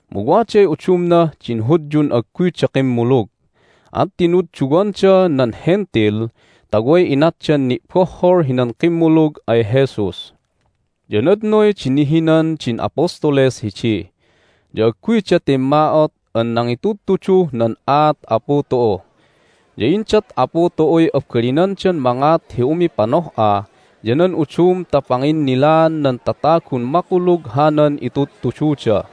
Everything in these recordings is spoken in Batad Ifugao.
Mu waday udumnah din Hudyun agguyda kimmulug, at tinudduwanda nan Hentil ta way inatdan ni'bohhol hinan kimmulug ay Jesus. Ya nadnoy di nihinan din apostoles hidi, ya agguyda timma'ot an nangitudtuduh nan aat Apu tu'u. Ya indat Apu tu'uy abalinandan mangat hi umipanoh'a ya nan udum ta panginnilaan nan tatagun makulug hanan itudtududa.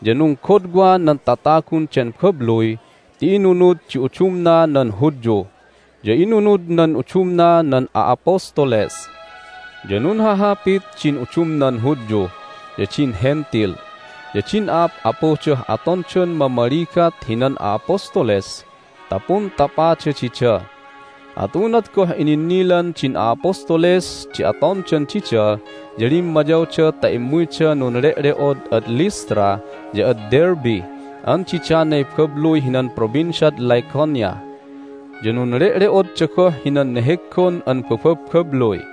Ya nunggodwa nan tatagun den babluy ti inunud di udumna nan Hudyu, ya inunud nan udumna nan a'apostoles. Ya nunhahapit din udumnan Hudyu, ya din Hentil, ya din a'ap'apudah atondan mamaligat hinan a'apostoles ta puntapada dida. At unat goh ininnilan din a'apostoles di atondan dida ya limmayawda ta immuyda nunle'le'od ad Lystra ya ad Derbe an didanay babluy hinan Provinciad Lycaonia. Ya nunle'le'odda goh hinan neheggon an bababbabluy.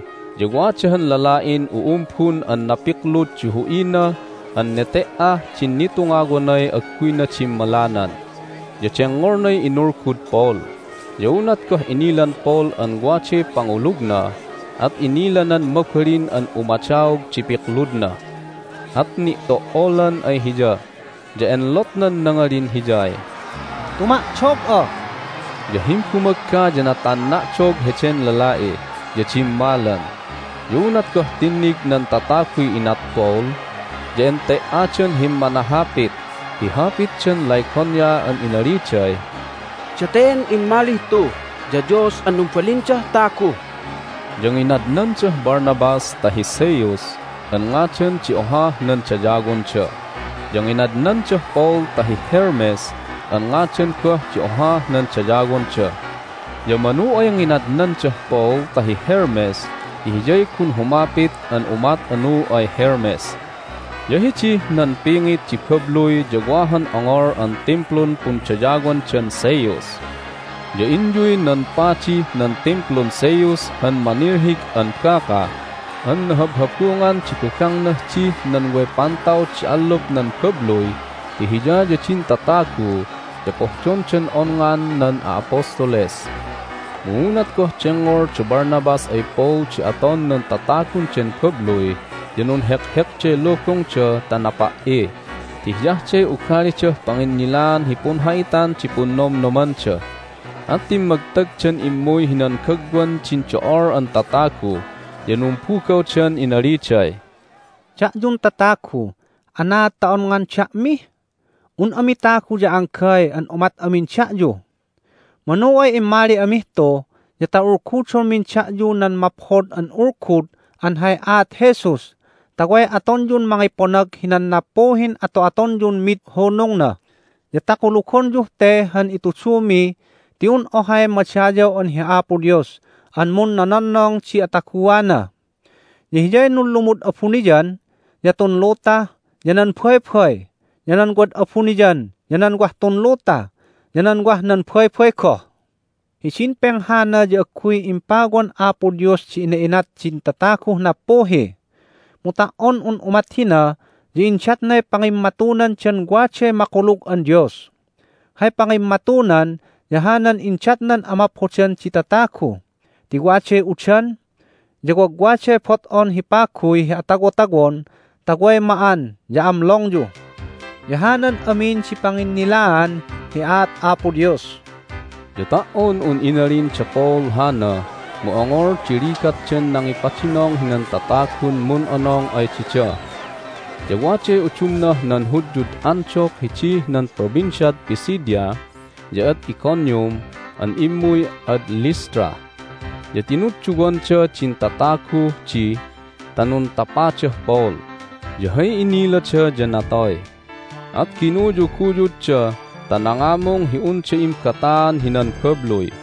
Hidid Lystra ya wada han lala'in u'umbun an napiklud di hu'ina an nete"ah din nitungawanay agguyna dimmalanan, ya dengngolnay inulgud Paul. Ya unat goh inilan Paul an waday pangulugna at inilanan mabalin an umadaog di pikludna. At ni'to"olan ay hiya, ya enlotnan nangalin hiyay, "Tuma"dog'a!" Ya himbumagga ya natanna'dog heden lala'i, ya dimmalan. Ya unat goh tinnig nan tataguy inat Paul ya ente"adan himmanahapit hi hapitdan Lycaonia an inaliday, "Daten immalih tu ya dios an numbalindah tagu!" Ya nginadnandah Barnabas ta hi Zeus an ngadan di ohah nan dayawonda, ya nginadnandah Paul ta hi Hermes an ngadan goh di ohah nan dayawonda. Ya manu ay nginadnandah Paul ta hi Hermes ti hiyay gun humapit an umat anu ay Hermes. Ya hidih nan pingit di babluy ya wa han ongol an timplun pundayawandan Zeus. Ya inyuy nan padih nan Timplun Zeus han manilhig an baka an nahabhabungan di bagangnah dih nan way pantaw di allup nan babluy ti hiya ya din tatagu ya pohdondan onngan nan a'apostoles. Mu unat goh dengngol da Barnabas ay Paul di aton nan tatagun den babluy ya nunhekhekday lubungda ta napi"i (ti hiyah de ugalidah panginnilaan hi punha'itan di punnomnomanda), at timmagtagdan immuy hinan gagwan din do'ol an tatagu, ya numbugawdan inaliday, "Da'yun tatagu, anaad ta onngan da'mi? Un ami tagu ya anggay an umat amin da'yu! Manu ay immali amih tu ya ta ulgudonmin da'yu nan Maphod an Ulgud an hay aat Jesus ta way atonyun mangiponag hinan nappuhin ato'atonyun mid hunungna, ya ta kulugonyuh te han itudumi ti un ohay madayaw an hi Apo Dios an munnononnong di ataguana! Ya Hiyay nunlumud abuniyan, ya tun luta, ya nan baybay, ya nan wad abuniyan, ya nan wah tun luta, ya nan wah nan baybay goh. Hidin penghana ya agguy impawan Apo Dios di ina'inat din tataguh nappuhi. Mu ta"on un umat hina ya indatnay pangimmatunandan waday makulug an Dios. Hay pangimmatunan ya hanan indatnan amaphodan di tatagu ti waday udan, ya wagwaday bot'on hi paguy hi atawotawon ta way ma'an ya amlongyu. Ya hanan amin di panginnilaan hi aat Apo Dios." Ya ta"on un inalin da Paul hana mu ongol di ligatdan nangipadinong hinan tatagun mun'onong ay dida. Ya waday udumnah nan Hudyud Antioch hidih nan Provinciad Pisidia ya ad Iconium an immuy ad Lystra, ya tinudduwanda din tataguh di ta nuntapadah Paul, ya hay inilada ya natoy, at ginuyuguyudda ta nangamung hi unda imbataan hinan babluy.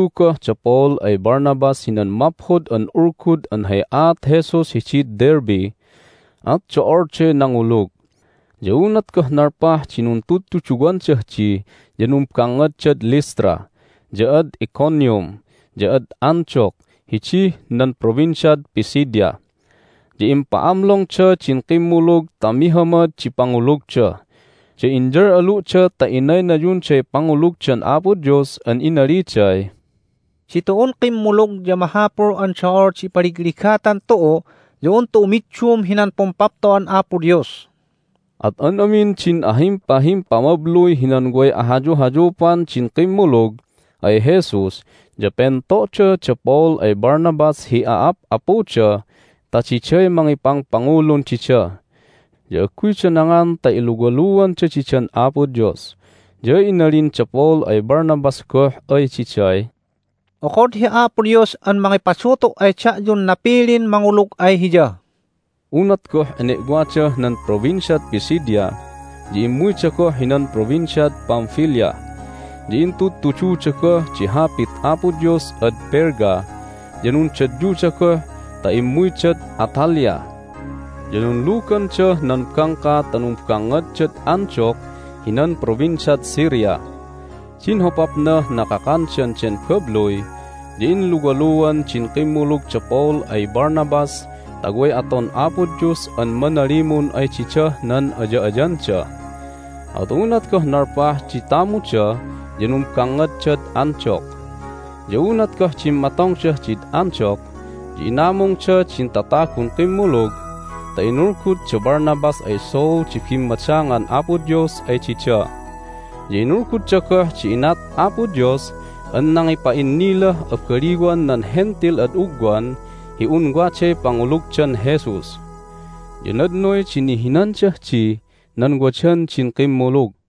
Nuntudtudu goh da Paul ay Barnabas hinan Maphod an Ulgud an hay aat Jesus hidid Derbe, at do'olday nangulug. Ya unat goh nalpah di nuntudtuduwandah di ya numbangngaddad Lystra, ya ad Iconium, ya ad Antioch hidih nan Provinciad Pisidia. Ya impa'amlongda din kimmulug ta mihamad di pangulugda, ya inyal'alu'da ta inaynayunday pangulugdan Apo Dios an inaliday, "Ditu'un kimmulug ya mahapul an do'ol di ipaligligatan tu'u ya un tu'u middum hinan Pumpapto'an Apo Dios!" At an amin din ahimpahimpamabluy hinan way ahayuhayupan din kimmulug ay Jesus ya pento'da da Paul ay Barnabas hi a'ap'apuda ta diday mangipangpangulun dida. Ya agguyda nangan ta iluwaluanda didan Apo Dios. Ya inalin da Paul ay Barnabas goh ay diday, "Okod hi Apo Dios an mangipadutu' ay da'yun napilin mangulug ay Hiya!" Unat goh ene'wadah nan Provinciad Pisidia ya immuyda goh hinan Provinciad Pamphylia. Ya intudtududa goh di Hapit Apo Dios ad Perga, ya nundadyuda goh ta immuydad Attalia. Ya nunlugandah nan bangka ta numbangngaddad Antioch hinan Provinciad Syria. Din hopapnah nakakandan den babluy ya inluwaluan din kimmulug da Paul ay Barnabas ta way aton Apo Dios an manalimun ay didah nan aya'ayanda. At unat goh nalpah di tamuda ya numbangngaddad Antioch. Ya unat goh dimmatongdah did Antioch ya inamungda din tatagun kimmulug ta inulgud da Barnabas ay Saul di bimmadangan Apo Dios ay dida, ya inulgudda goh di inat Apo Dios an nangipa'innilah abaliwan nan Hentil ad ugwan hi un waday pangulugdan Jesus. Ya nadnoy di nihinandah dih nan wadan din kimmulug.